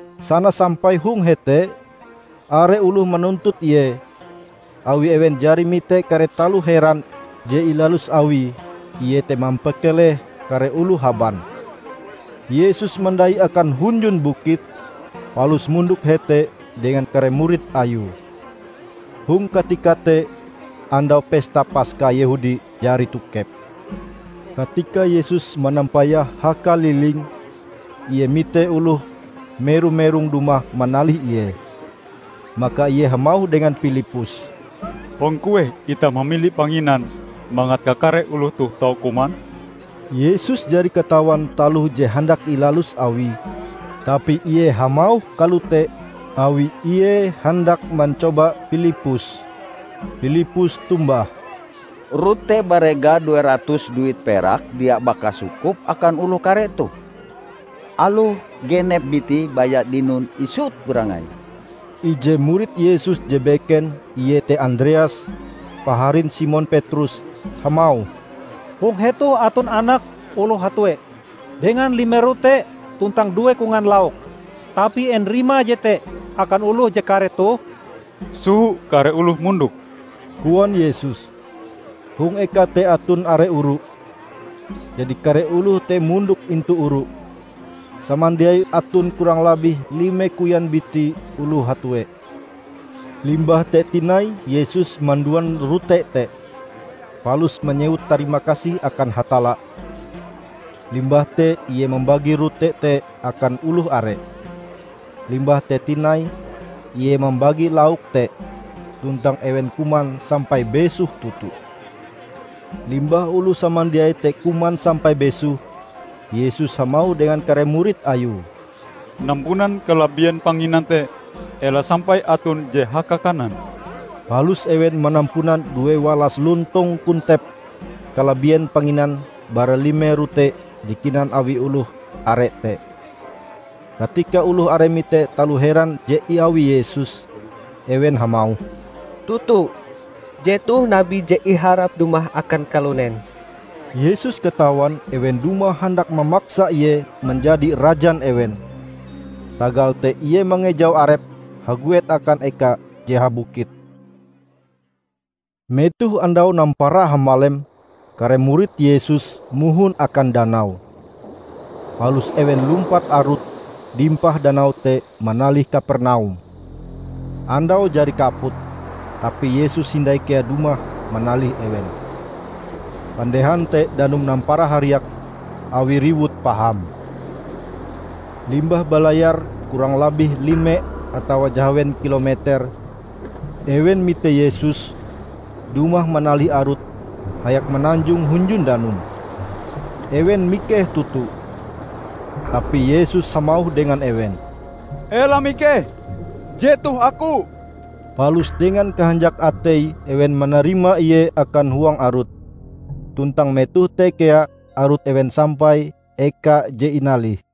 Sana sampai hong hete, are oloh manuntut Ie awi ewen jari mite kare taloh heran je ilalus Awie iete mampakeleh kare oloh haban. Yesus mandai akan hunjun bukit, palus mondok hete dengan kare murid Ayue. Hong katika te, Andau Pesta Paska Yehudi jari tokep. Katika Yesus manampayah hakaliling, Ie mite oloh mero-merong dumah manalih Ie. Maka Ie hamauh dengan Pilippus, "Hong kueh itah mamili panginan mangat kakare oloh toh tau kuman?" ( Yesus jari katawan taloh je handak ilalus Awie, tapi Ie hamauh kalote awi Ie handak mancoba Pilippus.) Pilippus tombah, "Rote barega due ratus duit perak dia baka sukup akan oloh kare toh, aloh genep biti baya dinon isut barangai." Ije murid Yesus je beken, iete Andreas, paharin Simon Petrus, hamauh, "Hong hetoh aton anak oloh hatue dengan lime rote tuntang due kongan lauk. Tapi en rimae jete akan oloh je kare toh?" "Soho kare oloh mondok," koan Yesus. Hong eka te aton are oru, jadi kare oloh te mondok intu oru -- samandiaie aton kurang labih lime koyan biti oloh hatue. Limbah te tinai Yesus manduan rote te, palus manyewut tarima kasih akan Hatalla. Limbah te Ie mambagi rote te akan oloh are. Limbah te tinai Ie mambagi lauk te, tuntang ewen kuman sampai besoh toto. Limbah oloh samandiai te kuman sampai besoh, Yesus hamauh dengan kare murid Ayue, "Nampunan kalabien panginan te; ela sampai aton je haka-kanan." Palus ewen manampunan duewalas lontong kontep kalabien panginan bara lime rote je kinan awi oloh are te. Katika oloh are mite taloh heran je iawi Yesus, ewen hamauh, "Toto, jetoh Nabi je iharap dumah akan kalunen!" Yesus katawan ewen dumah handak mamaksa Ie manjadi rajan ewen. Tagal te Ie mangejau arepe haguet akan eka je habukit. Metoh andau nampara hamalem, kare murid Yesus mohon akan danau. Palus ewen lumpat arut dimpah danau te manalih Kapernaum. Andau jari kaput, tapi Yesus hindai kea dumah manalih ewen. Pandehan te danum nampara hariak awi riwut paham. Limbah balayar kurang labih lime atawa jahawen kilometer, ewen mite Yesus dumah manalih arut hayak mananjong hunjun danum. Ewen mikeh toto. Tapi Yesus hamauh dengan ewen, "Ela mikeh, jetoh Aku!" Palus dengan kahanjak atei ewen manarima Ie akan huang arut, tuntang metoh te kea arut ewen sampai eka je inalih.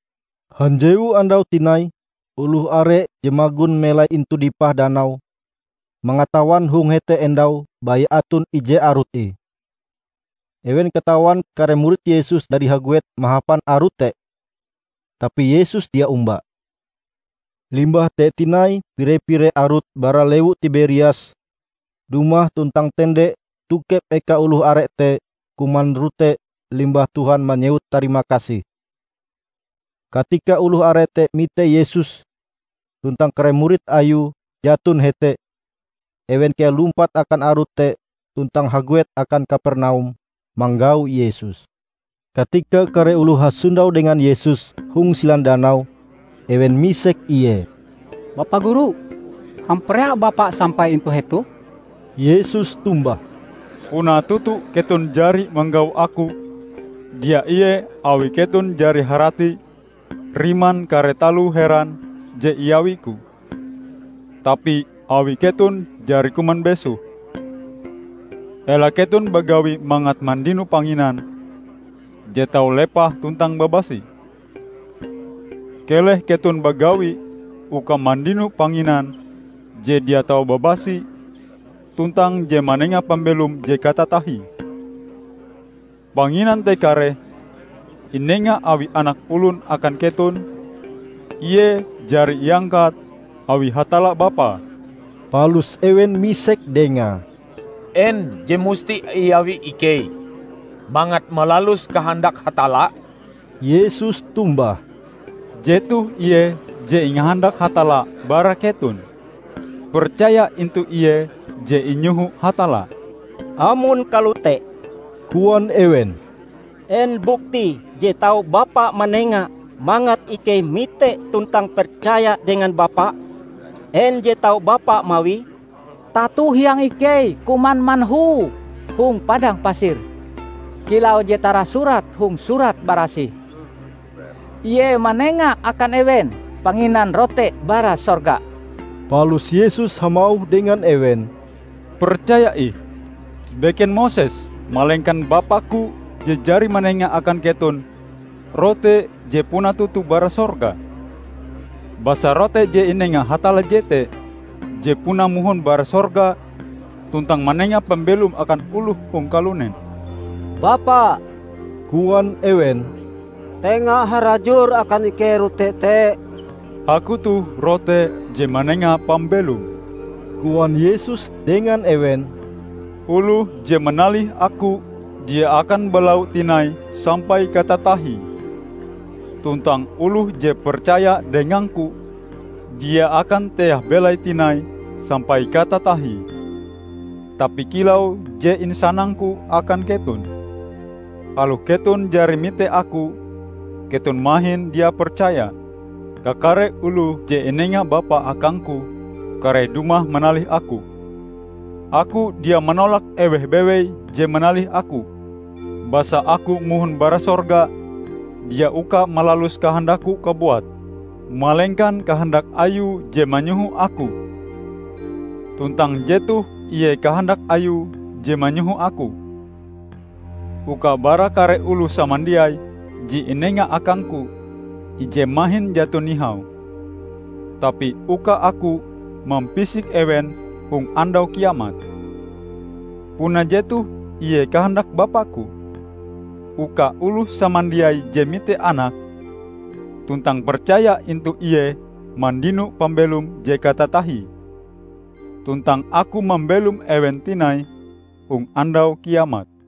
Hanjewu andau tinai oloh are je magon melai intu dipah danau, mangatawan hong hete endau baya aton ije arut ih. Ewen katawan kare murid Yesus jari haguet mahapan arut te, tapi Yesus dia omba. Limbah te tinai pire-pire arut bara lewu Tiberias dumah tuntang tende tokep eka oloh are te kuman rote limbah Tuhan manyewut tarimakasih. Katika oloh are te mite Yesus tuntang kare murid Ayue jaton hete, ewen kea lumpat akan arut te tuntang haguet akan Kapernaum manggau Yesus. Katika kare oloh hasondau dengan Yesus hong silan danau, ewen misek Ie, "Bapa Guru, hamparea Bapa sampai intu hetoh?" Yesus tombah, "Puna toto keton jari manggau Aku dia ie awi keton jari harati riman kare taloh heran je iawi-Ku, tapi awi keton jari kuman besoh. Ela keton bagawi mangat mandino panginan je tau lepah tuntang babasi. Keleh keton bagawi uka mandino panginan je dia tau babasi tuntang je manenga pambelom je katatahie. Panginan te kareh inenga awi Anak Olon akan keton, Ie jari iangkat awi Hatalla Bapa." Palus ewen misek dengae, "En je musti iawi ikei mangat malalus kahandak Hatalla?" Yesus tombah, "Jetoh ie je ingahandak Hatalla bara keton: percaya intu Ie je inyoho Hatalla." "Amon kalote," koan ewen "en buktie je tau Bapa manengae mangat ikei mitee tuntang percaya dengan Bapa? En je tau Bapa mawie? Tato hiang ikei kuman manhu hong padang pasir, kilau je tarasurat hong Surat Barasih, 'Ie manenga akan ewen panginan rote bara sorga.' " Palus Yesus hamauh dengan ewen, "Percaya ih: Beken Moses, malengkan Bapa-Ku je jari manenga akan keton rote je puna toto bara sorga. Basa rote je inenga Hatalla jete je puna mohon bara sorga tuntang manenga pambelom akan oloh hong kalunen." "Bapa," koan ewen, "tenga harajur akan ikei rote te." "Aku toh rote je manenga pambelom," koan Yesus dengan ewen. "Oloh je manalih Aku dia akan balau tinai sampai katatahie. Tuntang oloh je percaya dengang-Ku, dia akan teah belaie tinai sampai katatahie." "Tapi kilau je insanang-Ku akan keton, aloh keton jari mite Aku, keton mahin dia percaya. Kakare oloh je inenga Bapa akang-Ku kareh dumah manalih Aku. Aku dia manolak eweh bewei je manalih Aku. Basa Aku mohon bara sorga dia uka malalus kahandak-Ku kabuat, malengkan kahandak Ayue je manyoho Aku. Tuntang jetoh ie kahandak Ayue je manyoho Aku: uka bara kare oloh samandiai je inenga Akang-Ku, ije mahin jaton nihau; tapi uka Aku mampisik ewen hong Andau Kiamat. Puna jetoh ie kahandak Bapa-Ku: uka oloh samandiai je mite Anak, tuntang percaya intu Ie mandino pambelom je katatahie, tuntang Aku mambelom ewen tinai hong Andau Kiamat."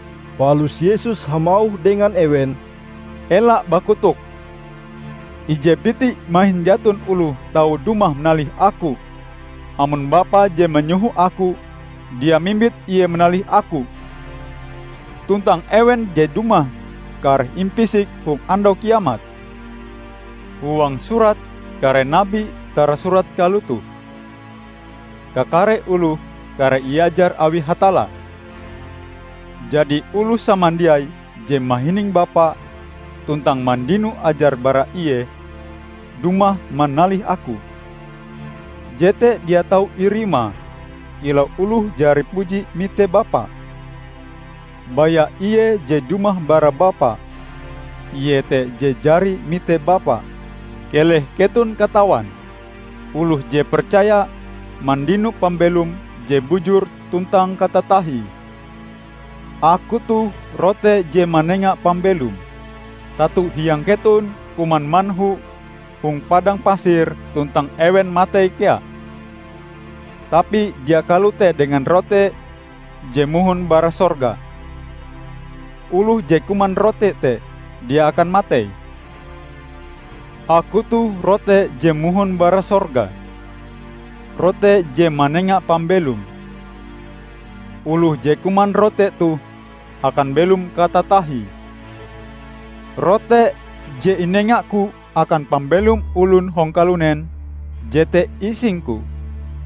Palus Yesus hamauh dengan ewen, "Ela bakotok. Ije biti mahin jaton oloh tau dumah manalih Aku, amon Bapa je manyoho Aku, dia mimbit ie manalih Aku; tuntang ewen je dumah, kareh impisik hong Andau Kiamat. Huang surat kare Nabi tarasurat kalotoh, 'Kakare oloh kareh iajar awi Hatalla.' Jadi oloh samandiai je mahining Bapa tuntang mandino ajar bara Ie, dumah manalih Aku. Jete dia tau irima kilau oloh jari puji mite Bapa. Baya Ie je dumah bara Bapa, Ie te je jari mite Bapa. Keleh keton katawan: Oloh je percaya, mandino pambelom je bujur tuntang katatahie. Aku toh rote je manenga pambelom. Tato hiang keton kuman manhu hong padang pasir tuntang ewen matei kea. Tapi dia kalote dengan rote je mohon bara sorga; oloh je kuman rote te dia akan matei. Aku toh rote je mohon bara sorga -- rote je manenga pambelom. Oloh je kuman rote toh akan belom katatahie. Rote je inenga-Ku akan pambelom olon hong kalunen, jete ising-Ku."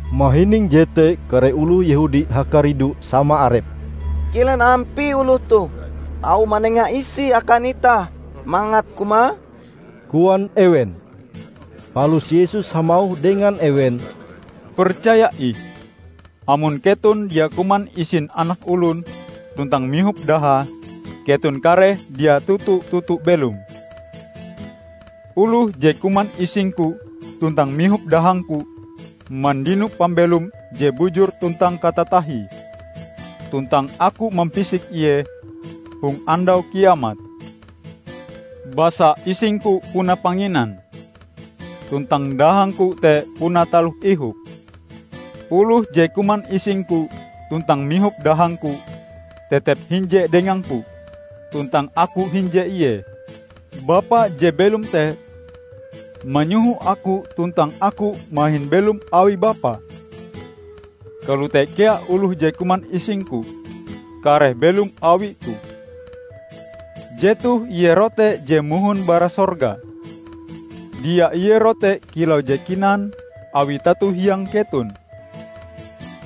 Mahining jete kare oloh Yehudi hakaridu sama arepe. "Kilen ampie oloh toh tau manenga isie akan itah mangat kumae?" koan ewen. Palus Yesus hamauh dengan ewen, "Percaya ih: Amon keton dia kuman isin Anak Olon tuntang mihop dahae, keton kareh dia toto-toto belom. Oloh je kuman ising-Ku tuntang mihop dahang-Ku mandino pambelom je bujur tuntang katatahie tuntang Aku mampisik ie hong Andau Kiamat. Basa ising-Ku puna panginan, tuntang dahang-Ku te puna taloh ihop. Oloh je kuman ising-Ku tuntang mihop dahang-Ku, tetep hinje dengang-Ku, tuntang Aku hinje ie. Bapa je belom te, manyoho Aku tuntang Aku mahin belom awi Bapa. Kalote kea oloh je kuman ising-Ku kareh belom awi-Ku. Jetoh Ie rote je mohon bara sorga: dia ie rote kilau je kinan awi tato hiang keton.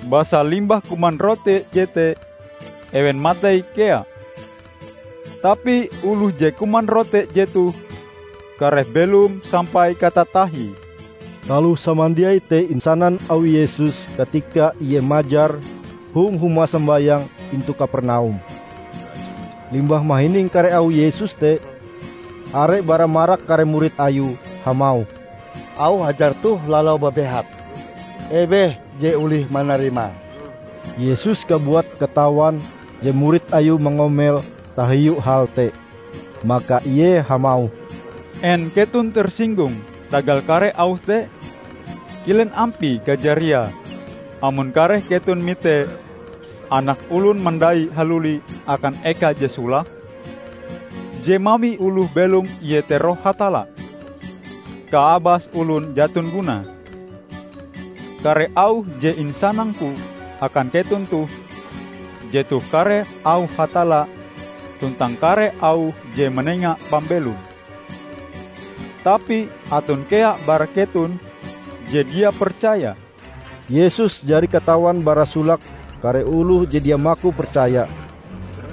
Basa limbah kuman rote jete, ewen matei kea. Tapi oloh je kuman rote jetoh kareh belom sampai katatahie." Taloh samandiai te isanan awi Yesus katika Ie majar hong huma sombayang intu Kapernaum. Limbah mahining kare auh Yesus te, are bara marak kare murid Ayue hamauh, "Auh ajar toh lalau babehat. Eweh je olih manarima!" Yesus kabuat katawan je murid Ayue mangomel tahiu hal te. Maka Ie hamauh, "En keton tersinggung tagal kare auh te? Kilen ampie kajariae amon kareh keton mite Anak Olon mandai haluli akan eka je solake? Je mawi oloh belom iete Roh Hatalla. Kaabas olon jaton gunae. Kare auh je insanang-Ku akan keton toh jetoh kare auh Hatalla tuntang kare auh je manenga pambelom. Tapi aton kea bara keton je dia percaya." (Yesus jari katawan bara solake kare oloh je dia maku percaya,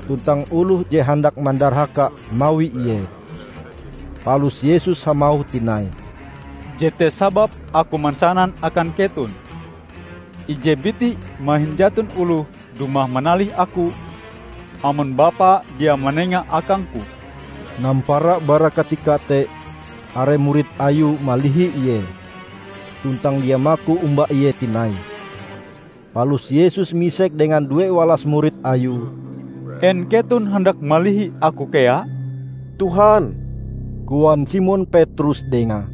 tuntang oloh je handak mandarhaka mawi Ie.) Palus Yesus hamauh tinai, "Jete sababe Aku mansanan akan keton ije biti mahin jaton oloh dumah manalih Aku, amon Bapa dia manengae akang-Ku." Nampara bara katika te are murid Ayue malihi Ie, tuntang dia maku omba Ie tinai. Palus Yesus misek dengan duewalas murid Ayue, "En keton handak malihi Aku kea?" "Tuhan," koan Simon Petrus Dengae,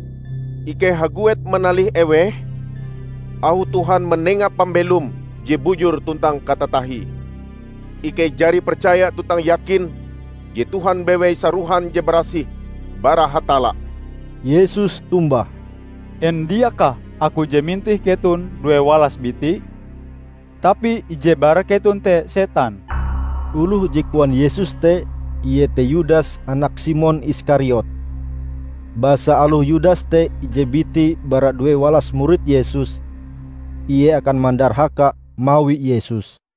"ikei haguet manalih eweh? Auh Tuhan manenga pambelom je bujur tuntang katatahie. Ikei jari percaya tuntang yakin je Tuhan bewei sarohan je barasih bara Hatalla." Yesus tombah, "En diakah Aku je mintih keton duewalas biti? Tapi ije bara keton te setan!" Oloh je koan Yesus te iete Yudas anak Simon Iskariot. Basa aloh Yudas te ije biti bara duewalas murid Yesus, ie akan mandarhaka mawi Yesus.